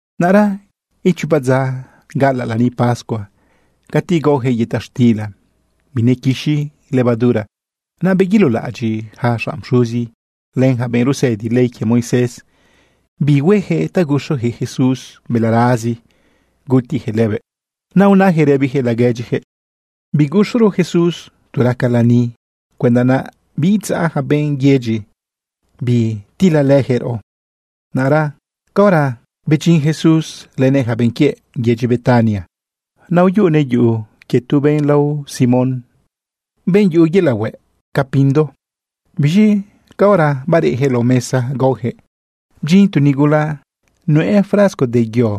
Naꞌra ichopa dza galaꞌ lani pascua cati gaoyaquëꞌ yëta xtila binequixi levadura. Naꞌ beguilolaꞌadyiꞌ yaca xanꞌ pxuzi len yaca benꞌ rusëdi ley quie Moisés bi hueyaquëꞌ ta guxuyaquëꞌ Jesús balarazi gutiyaquëꞌ lëbëꞌ. Naꞌ unayaquëꞌ rëbiyaquëꞌ laguedyiyaquëꞌ: ―Biguxuro Jesús tu raca lani cuenda naꞌ biidzaꞌ yaca benꞌ yedyi bitilalëyaquëꞌ raꞌo. Naꞌra caora bedyin Jesús lënëꞌ yaca benꞌ quiëꞌ yedyi Betania, naꞌ uyuꞌunëꞌ lidyi tu benꞌ lao Simón, benꞌ yuꞌu yelaꞌ hueꞌ ca pindo. Biz̃i caora bareꞌyaquëꞌ lao mesa gaoyaquëꞌ, bdyin tu nigula nuꞌë frasco de yo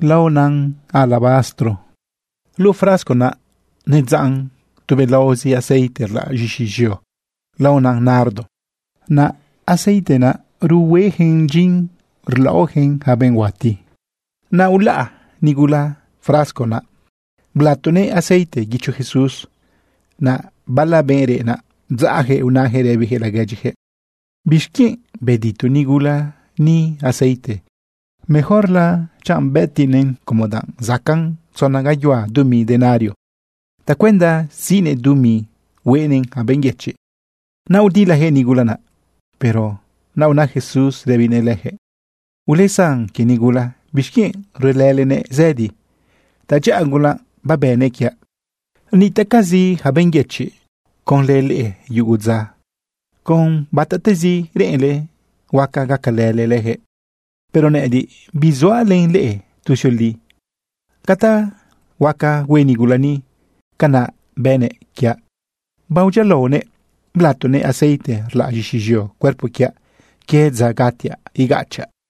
laona alabastro. Luꞌu frasco naꞌ nedzaꞌn tubelaozi aceite rlaꞌ z̃ixi z̃eo laonan nardo. Naꞌ aceite naꞌ ruhueyaquëꞌn dyin rlaꞌoyaquëꞌn yaca benꞌ huati. Naꞌ ulaꞌ nigula frasco naꞌ blatoguëꞌ aceite guicho Jesús. Naꞌ bala benꞌ reꞌ naꞌ bdzaꞌyaquëꞌ unayaquëꞌ rëbiyaquëꞌ laguedyiyaquëꞌ: ―¿Bixquienꞌ bedito nigula ni aceite? Mejorla chi bëtiꞌnëꞌn como danꞌ zacaꞌn tzona gayuhua dumi denario tacuenda siꞌnëꞌ dumi hueꞌnëꞌn yaca benꞌ yëchiꞌ. Naꞌ udilayaquëꞌ nigula naꞌ. Pero naꞌ una Jesús rëbinëꞌ leyaquëꞌ: ―Ulesan quie nigula. ¿Bixquienꞌ ruelëlenëꞌ zëdi? Tadyaꞌa gula babënëꞌ quiaꞌ. Nitaꞌcazi yaca benꞌ yëchiꞌ conlë leꞌe yugu dza. Con batatezi reꞌenle, huaca gacalële leyaquëꞌ. Pero nëꞌëdiꞌ bisuaꞌ len leꞌe tuzioli. Ca ta huaca hue nigula ni, canaꞌ bënëꞌ quiaꞌ. Badyialaonëꞌ blatoguëꞌ aceite rlaꞌ z̃ixi z̃eo cuerpo quiaꞌ quie dza gatiaꞌ igachaꞌ.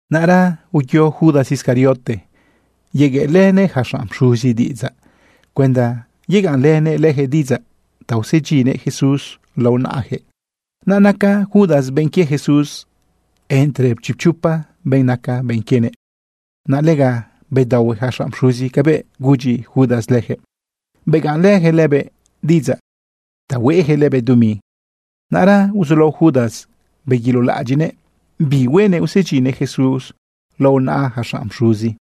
Naꞌra uyo Judas Iscariote yegueꞌlënëꞌ yaca xanꞌ pxuzi diꞌidzaꞌ cuenda yegaꞌnlënëꞌ leyaquëꞌ diꞌidzaꞌ ta usedyinnëꞌ Jesús lao naꞌayaquëꞌ. Naꞌ naca Judas benꞌ quie Jesús entre chipchopa benꞌ naca benꞌ quienëꞌ. Naꞌ lega bedaohue yaca xanꞌ pxuzi cabëꞌ gudyi Judas leyaquëꞌ. Begaꞌnlëyaquëꞌ lëbëꞌ diꞌidzaꞌ ta hueꞌyaquëꞌ lëbëꞌ dumi. Naꞌra uzulao Judas beguilolaꞌadyiꞌnëꞌ bi huenëꞌ usedyinnëꞌ Jesús lao naꞌa yaca xanꞌ pxuzi.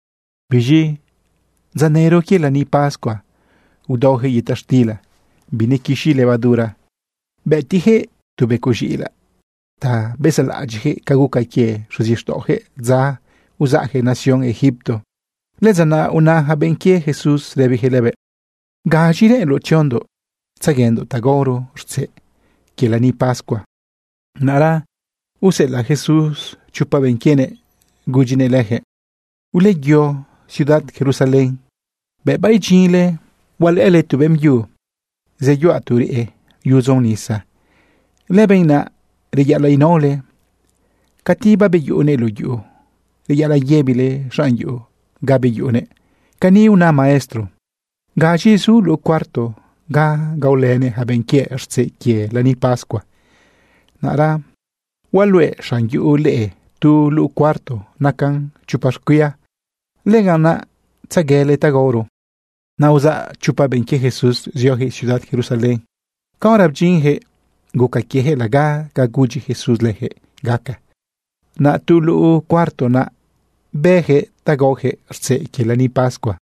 Biz̃i dza nëro quie lani pascua udaoyaquëꞌ yëta xtila binequixi levadura, bëtiyaquëꞌ tu becoꞌ z̃iꞌilaꞌ ta bezaꞌlaꞌadyiꞌyaquëꞌ ca guca quie xuzixtaꞌoyaquëꞌ dza uzaꞌyaquëꞌ nación Egipto. Lëdza naꞌ una yaca benꞌ quie Jesús rëbiyaquëꞌ lëbëꞌ: ―¿Gaz̃i reꞌenloꞌ tziondoꞌ tzaguendoꞌ ta gaoro rtzeꞌ quie lani pascua? Naꞌra useꞌelaꞌ Jesús chopa benꞌ quienëꞌ gudyinëꞌ leyaquëꞌ: ―Uleyo ciudad Jerusalén. Bëꞌ baidyinle hualëꞌële tu beꞌmbyu zeyuꞌa tu reꞌe yudzon nisa. Lëbenꞌ naꞌ reyaꞌalaꞌ inaole. Cati babeyuꞌunëꞌ luꞌu yuꞌu, reyaꞌalaꞌ yëbile xanꞌ yuꞌu ga beyuꞌunëꞌ: “Cani una Maestro: ¿Gaz̃i zu luꞌu cuarto ga gaolënëꞌ yaca benꞌ quiëꞌ rtzeꞌ quie lani pascua?” Naꞌra hualuꞌe xanꞌ yuꞌu leꞌe tu luꞌu cuarto naca chopa xcuia. Lëganꞌ naꞌ tzaguele ta gaoro. Naꞌ uzaꞌ chopa benꞌ quie Jesús zioyaquëꞌ ciudad Jerusalén. Caora bedyinyaquëꞌ guca quieyaquëꞌ laga ca gudyi Jesús leyaquëꞌ gaca. Naꞌ tu luꞌu cuarto naꞌ bëyaquëꞌ ta gaoyaquëꞌ rtzeꞌ quie lani pascua.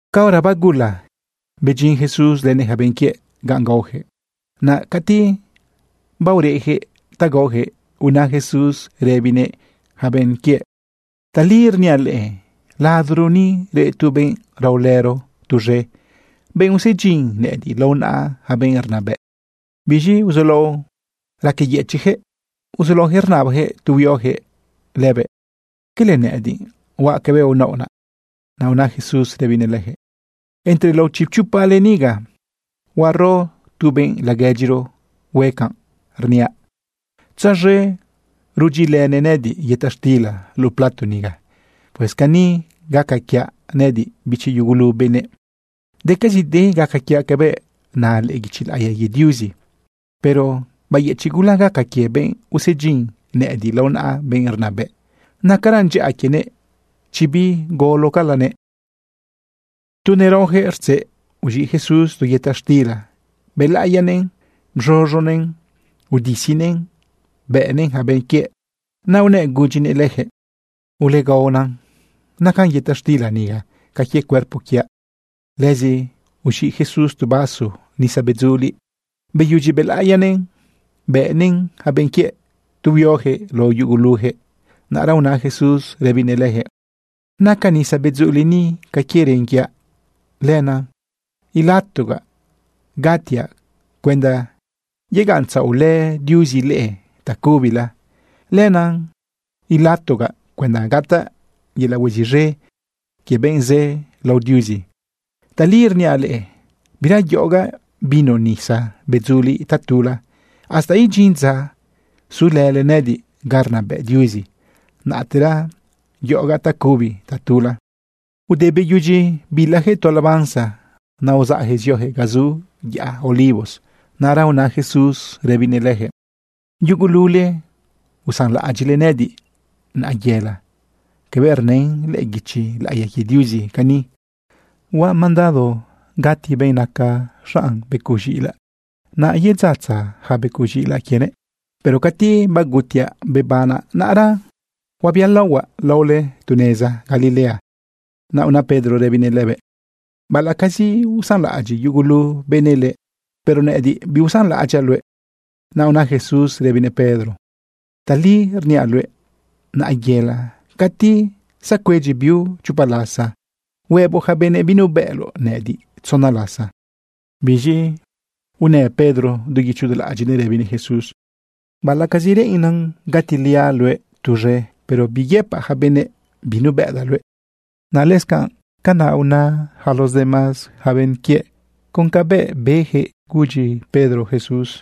Caora bagula, bedyin Jesús lënëꞌ yaca benꞌ quiëꞌ ganꞌ gaoyaquëꞌ. Naꞌ cati baoreꞌyaquëꞌ ta gaoyaquëꞌ, una Jesús rëbinëꞌ yaca benꞌ quiëꞌ: ―Tali rniaꞌ leꞌe, ladoro ni reꞌ tu benꞌ raolëro tuz̃e, benꞌ usedyin nëꞌëdiꞌ lao naꞌa yaca benꞌ rnabëꞌ. Biz̃i uzulao raqueyëchiꞌyaquëꞌ uzulaoyaquëꞌ rnabayaquëꞌ tu huioyaquëꞌ lëbëꞌ: ―¿Quele nëꞌëdiꞌ huaꞌ cabëꞌ naoꞌ naꞌ? Naꞌ una Jesús rëbinëꞌ leyaquëꞌ: ―Entre lao chipchopale niga, huaro tu benꞌ laguedyiro hue canꞌ rniaꞌ. Tzaz̃e rudyilënëꞌ nëꞌëdiꞌ yëta xtila luꞌu plato niga. Pues cani gaca quiaꞌ nëꞌëdiꞌ, bichi yugulu benëꞌ, decazide gaca quiaꞌ cabëꞌ na lëꞌë guichi laꞌiya quie Diuzi. Pero bayëchiꞌ gula gaca quie benꞌ usedyin nëꞌëdiꞌ lao naꞌa benꞌ rnabëꞌ. Nacaran dyaꞌa quienëꞌ chi bigolocalanëꞌ. Tu neraoyaquëꞌ rtzeꞌ, uz̃iꞌ Jesús tu yëta xtila, bëlaꞌiyanëꞌn bz̃uz̃unëꞌn udisinëꞌn bëꞌnëꞌn yaca benꞌ quiëꞌ. Naꞌ unëꞌ gudyinëꞌ leyaquëꞌ: ―Ulegaona. Naca yëta xtila niga ca quie cuerpo quiaꞌ. Lëzi uz̃iꞌ Jesús tu vaso nisa bedzuliꞌ. Beyudyi bëlaꞌiyanëꞌn, bëꞌnëꞌn yaca benꞌ quiëꞌ tu huioyaquëꞌ lao yuguluyaquëꞌ. Naꞌra una Jesús rëbinëꞌ leyaquëꞌ: ―Naca nisa bedzuliꞌ ni ca quie ren quiaꞌ. Lenaꞌ ilatogaꞌ gatiaꞌ cuenda yegaꞌntzaꞌolë Diuzi leꞌe tacubila. Lenaꞌ ilatogaꞌ cuenda gataꞌ yelaꞌ hueziꞌz̃e quie benꞌ zë lao Diuzi. Tali rniaꞌ leꞌe, bira yoꞌogaꞌ vino nisa bedzuliꞌ tatula. Hasta idyin dza zulële nëꞌëdiꞌ ga rnabëꞌ Diuzi, naꞌtera yoꞌogaꞌ tacubi tatula. Ude beyudyi bilayaquëꞌ tu alabanza, naꞌ uzaꞌyaquëꞌ zioyaquëꞌ ga zu yaꞌa Olivos. Naꞌra una Jesús rëbinëꞌ leyaquëꞌ: ―Yugulule usanlaꞌadyiꞌle nëꞌëdiꞌ naꞌayela. Cabëꞌ rnën lëꞌë guichi laꞌiya quie Diuzi cani: “Huaꞌ mandado gati benꞌ naca xaꞌn z̃iꞌilaꞌ, naꞌ yedzatza yaca becoꞌ z̃iꞌilaꞌ quienëꞌ.” Pero cati bagutiaꞌ bebanaꞌ, naꞌra huabialaohuaꞌ laole tu neza Galilea. Naꞌ una Pedro rëbinëꞌ lëbëꞌ: ―Baꞌalaꞌcazi usanlaꞌadyiꞌ yugulu benëꞌ leꞌe, pero nëꞌëdiꞌ biusanlaꞌadyaꞌ luëꞌ. Naꞌ una Jesús rëbinëꞌ Pedro: ―Tali rniaꞌ luëꞌ. Naꞌayela, cati zacuedyi biu chopa lasa, huëboꞌ yaca benëꞌ binubëꞌloꞌ nëꞌëdiꞌ tzona lasa. Biz̃i unë Pedro du guicho du laꞌadyiꞌnëꞌ rëbinëꞌ Jesús: ―Baꞌalaꞌcazi reꞌennan gatiliaꞌ luëꞌ tuz̃e, pero biyëpaꞌ yaca benëꞌ binubëꞌdaꞌ luëꞌ. Naꞌ lëscanꞌ canaꞌ una yaca los demás benꞌ quiëꞌ con ca beyaquëꞌ gudyi Pedro Jesús.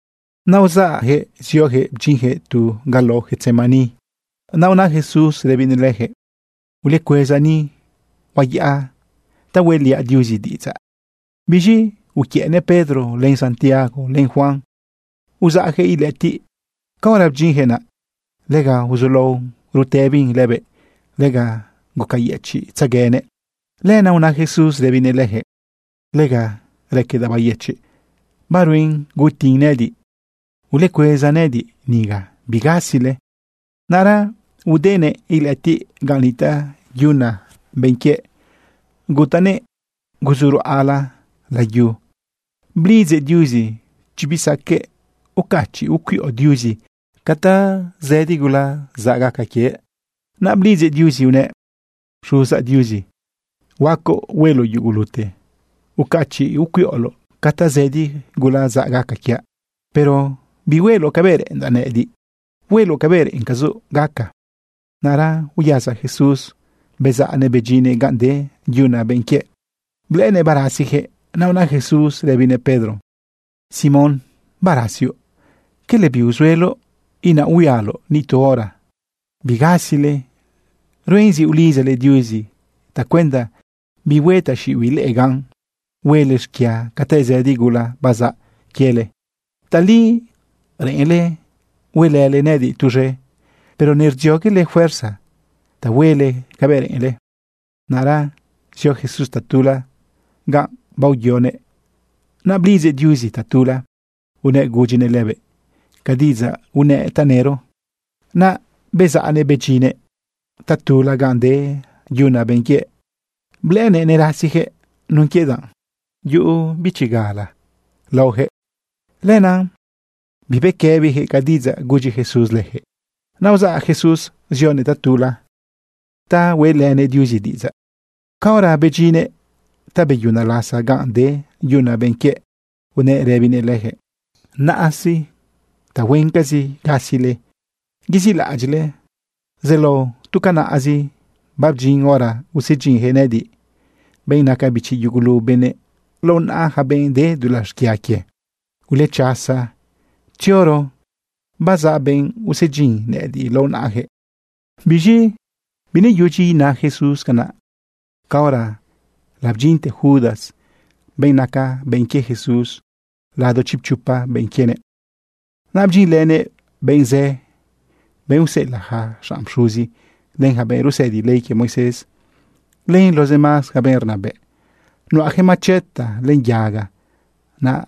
Naꞌ uzaꞌyaquëꞌ zioyaquëꞌ bdyinyaquëꞌ tu ga lao Getsemaní. Naꞌ una Jesús rëbinëꞌ leyaquëꞌ: ―Ulecueza ni. Huayaꞌa ta hueꞌliaꞌ Diuzi diꞌidzaꞌ. Biz̃i uquiëꞌnëꞌ Pedro, len Santiago, len Juan, uzaꞌyaquëꞌ ilëꞌëtiꞌ. Caora bdyinyaquëꞌ naꞌ, lega uzulaon rutëbin lëbëꞌ, lega gucayëchiꞌtzeguenëꞌ. Lenaꞌ una Jesús rëbinëꞌ leyaquëꞌ: ―Lega raquedaꞌ bayëchiꞌ. Baruen gutin nëꞌëdiꞌ. Ulecueza nëꞌëdiꞌ niga. Bigasile. Naꞌra udenëꞌ ilëꞌëtiꞌ ganꞌ nitaꞌ yuna benꞌ quiëꞌ, gutanëꞌ ruzu ruꞌala layu, blidzëꞌ Diuzi chi bisaqueꞌ ucachiꞌ ucuiꞌo Diuzi ca tazëdi gula zaꞌ gaca quiëꞌ. Naꞌ blidzëꞌ Diuzi unëꞌ: ―Xuzaꞌ Diuzi, huacoꞌ hueloꞌ yugulute. Ucachiꞌ ucuiꞌoloꞌ ca tazëdi gula zaꞌ gaca quiaꞌ. Pero bihueloꞌ cabëꞌ reꞌendaꞌ nëꞌëdiꞌ, hueloꞌ cabëꞌ reꞌencazoꞌ gaca. Naꞌra uyasa Jesús bezaꞌnëꞌ bedyinnëꞌ ganꞌ de yuna benꞌ quiëꞌ, blëꞌënëꞌ barasiyaquëꞌ. Naꞌ una Jesús rëbinëꞌ Pedro: ―Simón, ¿barasioꞌ? ¿Quele biuzueloꞌ inaꞌhuialoꞌ ni tu hora? Bigasile. Ruen zi ulidzale Diuzi tacuenda bihue taxiꞌibiꞌ leꞌe gan huele xquia ca tazëdi gula bazaꞌ quiele. Tali reꞌenle huelële nëꞌëdiꞌ tuz̃e, pero nerdzioguele fuerza ta huele cabëꞌ reꞌenle. Naꞌra zio Jesús tatula ganꞌ baoyoguëꞌ, naꞌ blidzëꞌ Diuzi tatula unëꞌ gudyinëꞌ lëbëꞌ ca diꞌidzaꞌ unëꞌ tanëro. Naꞌ bezaꞌnëꞌ bedyinnëꞌ tatula ganꞌ de yuna benꞌ quiëꞌ. Blëꞌënëꞌ nerasiyaquëꞌ nun quie danꞌ yuꞌu bichi gula laojëꞌ. Lenaꞌ bibequëbiyaquëꞌ ca diꞌidzaꞌ gudyi Jesús leyaquëꞌ. Naꞌ uzaꞌ Jesús zionëꞌ tatula ta hueꞌlënëꞌ Diuzi diꞌidzaꞌ. Caora bedyinnëꞌ ta beyuna lasa ganꞌ de yuna benꞌ quiëꞌ, unëꞌ rëbinëꞌ leyaquëꞌ: ―Naꞌa sí, tahuencazi gasile yezilaꞌadyiꞌle. Zelao tu canaꞌzi. Babdyin hora usedyinyaquëꞌ nëꞌëdiꞌ, benꞌ naca bichi yugulu benëꞌ, lao naꞌa yaca benꞌ de dulaꞌ xquia quie. Ulechasa, tzioro. Bazaꞌ benꞌ usedyin nëꞌëdiꞌ lao naꞌayaquëꞌ. Biz̃i bineyudyi ina Jesús canaꞌ, caora labdyinte Judas, benꞌ naca benꞌ quie Jesús lado chipchopa benꞌ quienëꞌ. Naꞌ bdyinlënëꞌ benꞌ zë, benꞌ useꞌelaꞌ yaca xanꞌ pxuzi, len yaca benꞌ rusëdi ley quie Moisés, len los demás yaca benꞌ rnabëꞌ. Nuꞌayaquëꞌ macheta len yaga. Naꞌ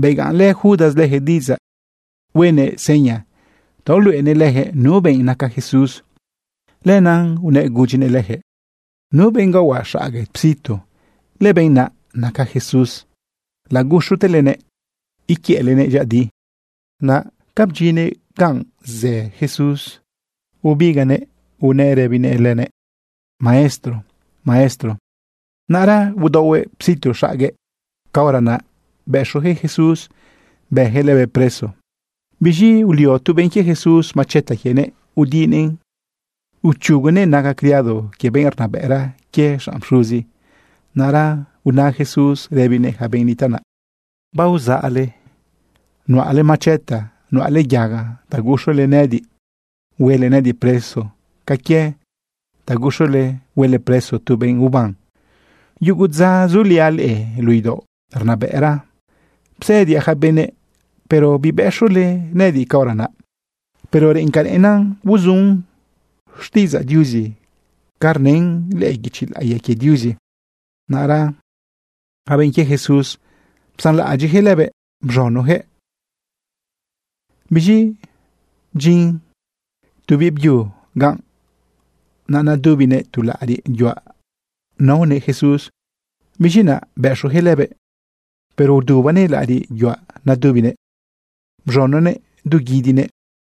begaꞌnlë Judas leyaquëꞌ diꞌidzaꞌ huenëꞌ seña ta uluꞌenëꞌ leyaquëꞌ nu benꞌ naca Jesús. Lenaꞌ unëꞌ gudyinëꞌ leyaquëꞌ: ―Nu benꞌ gaohuaꞌ xague psitu, lëbenꞌ naꞌ naca Jesús. Laguxutelenëꞌ iquiëꞌlenëꞌ dyëꞌëdi. Naꞌ ca bdyinnëꞌ ganꞌ zë Jesús bebigaꞌnëꞌ unëꞌ rëbinëꞌ lëbëꞌ: ―Maestro, Maestro. Naꞌra udaohuëꞌ psitu xaguëꞌ. Caora naꞌ bëxuyaquëꞌ Jesús bëyaquëꞌ lëbëꞌ preso. Biz̃i ulio tu benꞌ quie Jesús macheta quienëꞌ udinëꞌn uchugunëꞌ naga criado quie benꞌ rnabëꞌra quie yaca xanꞌ pxuzi. Naꞌra una Jesús rëbinëꞌ yaca benꞌ nitaꞌ naꞌ: ―¿Barzaꞌle nuꞌale macheta, nuꞌale yaga ta guxule nëꞌëdiꞌ huele nëꞌëdiꞌ preso ca quie ta guxule huele preso tu benꞌ uban? Yugu dza zuliaꞌ leꞌe luꞌu idaoꞌ rnabëꞌra psëdiaꞌ yaca benëꞌ, pero bibëxule nëꞌëdiꞌ caora naꞌ. Pero reꞌen ca reꞌena uzun xtiꞌidzaꞌ Diuzi ca rnën lëꞌë guichi laꞌiya quie Diuzi. Naꞌra yaca benꞌ quie Jesús psanlaꞌadyiꞌyaquëꞌ lëbëꞌ, bz̃unoyaquëꞌ. Biz̃i bdyin tu biꞌbyu ganꞌ. Naꞌ nadubinëꞌ tu laꞌariꞌ yuaꞌ naonëꞌ Jesús. Biz̃i naꞌ bëxuyaquëꞌ lëbëꞌ, pero udubanëꞌ laꞌariꞌ yuaꞌ nadubinëꞌ, bz̃unonëꞌ dú guidinëꞌ.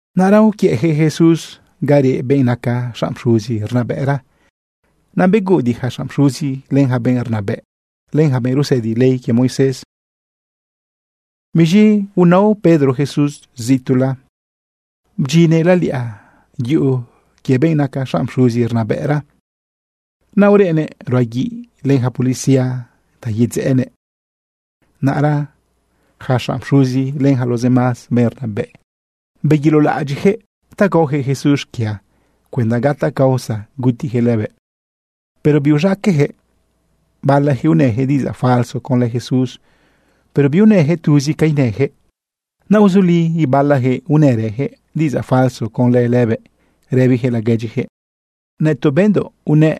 Naꞌra uquiëꞌyaquëꞌ Jesús ga reꞌ benꞌ naca xanꞌ pxuzi rnabëꞌra. Naꞌ beguꞌudiꞌ yaca xanꞌ pxuzi, len yaca benꞌ rnabëꞌ, len yaca benꞌ rusëdi ley quie Moisés. Biz̃i unao Pedro Jesús zituꞌla. Bdyinnëꞌ laliꞌa yuꞌu quie benꞌ naca xanꞌ pxuzi rnabëꞌra. Naꞌ ureꞌnëꞌ ruꞌa guiꞌ len yaca policía ta yedzeꞌenëꞌ. Naꞌra yaca xanꞌ pxuzi len yaca los demás benꞌ rnabëꞌ, beguilolaꞌadyiꞌyaquëꞌ ta gaoyaquëꞌ Jesús xquia cuenda gataꞌ causa gutiyaquëꞌ lëbëꞌ, pero biuz̃aqueꞌyaquëꞌ. Balayaquëꞌ unëyaquëꞌ diꞌidzaꞌ falso conlë Jesús, pero biunëyaquëꞌ tuzi ca inëyaquëꞌ. Naꞌ uzuli ibalayaquëꞌ unërëyaquëꞌ diꞌidzaꞌ falso conlë lëbëꞌ rëbiyaquëꞌ laguedyiyaquëꞌ: ―Nëtoꞌ bendoꞌ unëꞌ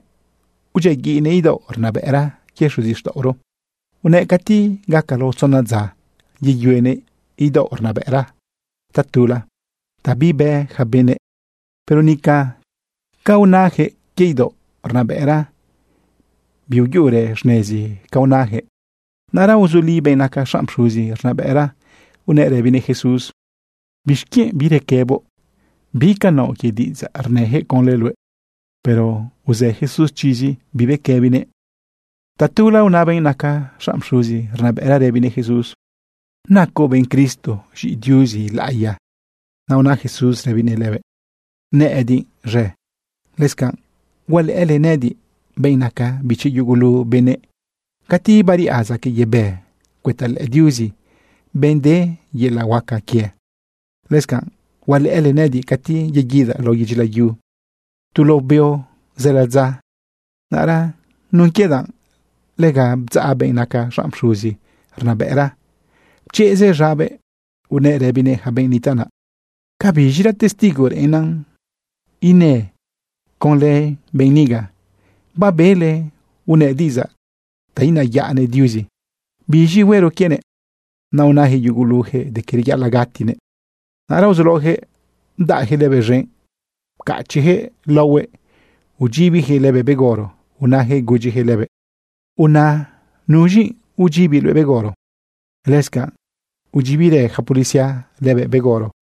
udyiaguiꞌnëꞌ idaoꞌ rnabëꞌra quie xuzixtaꞌoro, unëꞌ cati gaca lao tzona dza, yeyuenëꞌ idaoꞌ rnabëꞌra tula, ta bibë yaca benëꞌ. Pero nica ca unayaquëꞌ quie idaoꞌ rnabëꞌra, biuyuꞌurë xnezi ca unayaquëꞌ. Naꞌra uzuli benꞌ naca xanꞌ pxuzi rnabëꞌra unëꞌ rëbinëꞌ Jesús: ―¿Bixquienꞌ birequëboꞌ? ¿Bi ca naoꞌ quie diꞌidzaꞌ rnëyaquëꞌ conlë luëꞌ? Pero uzë Jesús chizi, bibequëbinëꞌ. Tatula una benꞌ naca xanꞌ pxuzi rnabëꞌra rëbinëꞌ Jesús: ―¿Nacoꞌ benꞌ Cristo, z̃iꞌi Diuzi laꞌiya? Naꞌ una Jesús rëbinëꞌ lëbëꞌ: ―Nëꞌëdiꞌ z̃e. Lëscanꞌ hualëꞌële nëꞌëdiꞌ, benꞌ naca bichi yugulu benëꞌ, cati bariꞌa zaquëꞌ yebë cuëta lëꞌë Diuzi, benꞌ de yelaꞌ huaca quie. Lëscanꞌ hualëꞌële nëꞌëdiꞌ cati yeguidaꞌ lao yedyi layu tu lao beo zë ladza. Naꞌra nun quie danꞌ lega bdzaꞌ benꞌ naca xanꞌ pxuzi rnabëꞌra, pchezëꞌ z̃abëꞌ unëꞌ rëbinëꞌ yaca benꞌ nitaꞌ naꞌ: ―¿Cabiz̃ira testigo reꞌennan inë conlë benꞌ niga? Babele unëꞌ diꞌidzaꞌ ta inayaꞌnëꞌ Diuzi. ¿Biz̃i huero quienëꞌ? Naꞌ unayaquëꞌ yuguluyaquëꞌ de que reyaꞌalaꞌ gatinëꞌ. Naꞌra uzulaoyaquëꞌ bdaꞌyaquëꞌ lëbëꞌ z̃enꞌ, pcachiꞌyaquëꞌ laohuëꞌ udyibiyaquëꞌ lëbëꞌ begoro, unayaquëꞌ gudyiyaquëꞌ lëbëꞌ: ―¡Una nuz̃i udyibi luëꞌ begoro! Lëscanꞌ udyibirë yaca policía lëbëꞌ begoro.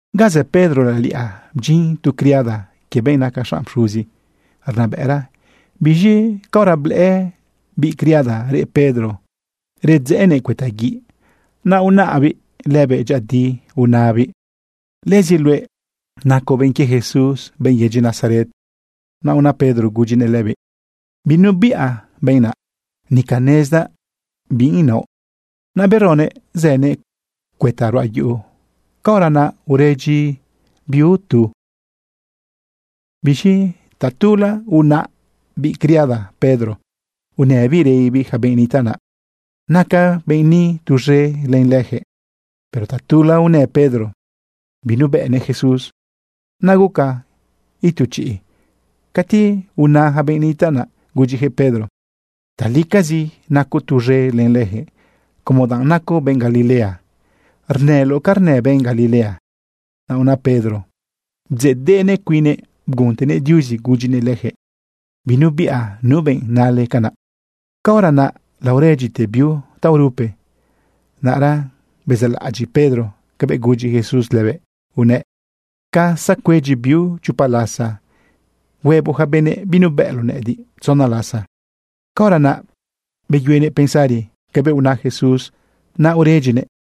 Ga zë Pedro laliꞌa bdyin tu criada quie benꞌ naca xanꞌ pxuzi rnabëꞌra. Biz̃i caora blëꞌë biꞌ criada reꞌ Pedro redzëꞌënëꞌ cuëta guiꞌ, naꞌ unaꞌbiꞌ lëbëꞌ dyëꞌëdi unabiꞌ: ―Lëzi luëꞌ nacoꞌ benꞌ quie Jesús, benꞌ yedyi Nazaret. Naꞌ una Pedro gudyinëꞌ lëbiꞌ: ―Binubiꞌa benꞌ naꞌ, nica nezdaꞌ bi inaoꞌ. Naꞌ beronëꞌ zënëꞌ cuëta ruꞌa yuꞌu. Caora naꞌ uredyi biu tu. Biz̃i tatula unaꞌ biꞌ criada Pedro unëbiꞌ rëbibiꞌ yaca benꞌ nitaꞌ naꞌ: ―Naca benꞌ ni tuz̃e len leyaquëꞌ. Pero tatula unë Pedro binubëꞌnëꞌ Jesús. Naꞌ guca itu chiꞌ cati una yaca benꞌ nitaꞌ naꞌ gudyiyaquëꞌ Pedro: ―Talicazi nacoꞌ tuz̃e len leyaquëꞌ, como danꞌ nacoꞌ benꞌ Galilea rnëloꞌ ca rnë benꞌ Galilea. Naꞌ una Pedro bdzeꞌdeꞌnëꞌ cuinnëꞌ bguntenëꞌ Diuzi gudyinëꞌ leyaquëꞌ: ―Binubiꞌa nu benꞌ nale canaꞌ. Caora naꞌ laoredyite biu taorupe. Naꞌra bezaꞌlaꞌadyiꞌ Pedro cabëꞌ gudyi Jesús lëbëꞌ unëꞌ: “Ca zacuedyi biu chopa lasa, huëboꞌ yaca benëꞌ binubëꞌloꞌ nëꞌëdiꞌ tzona lasa.” Caora naꞌ beyuenëꞌ pensari cabëꞌ una Jesús, naꞌ uredyinëꞌ.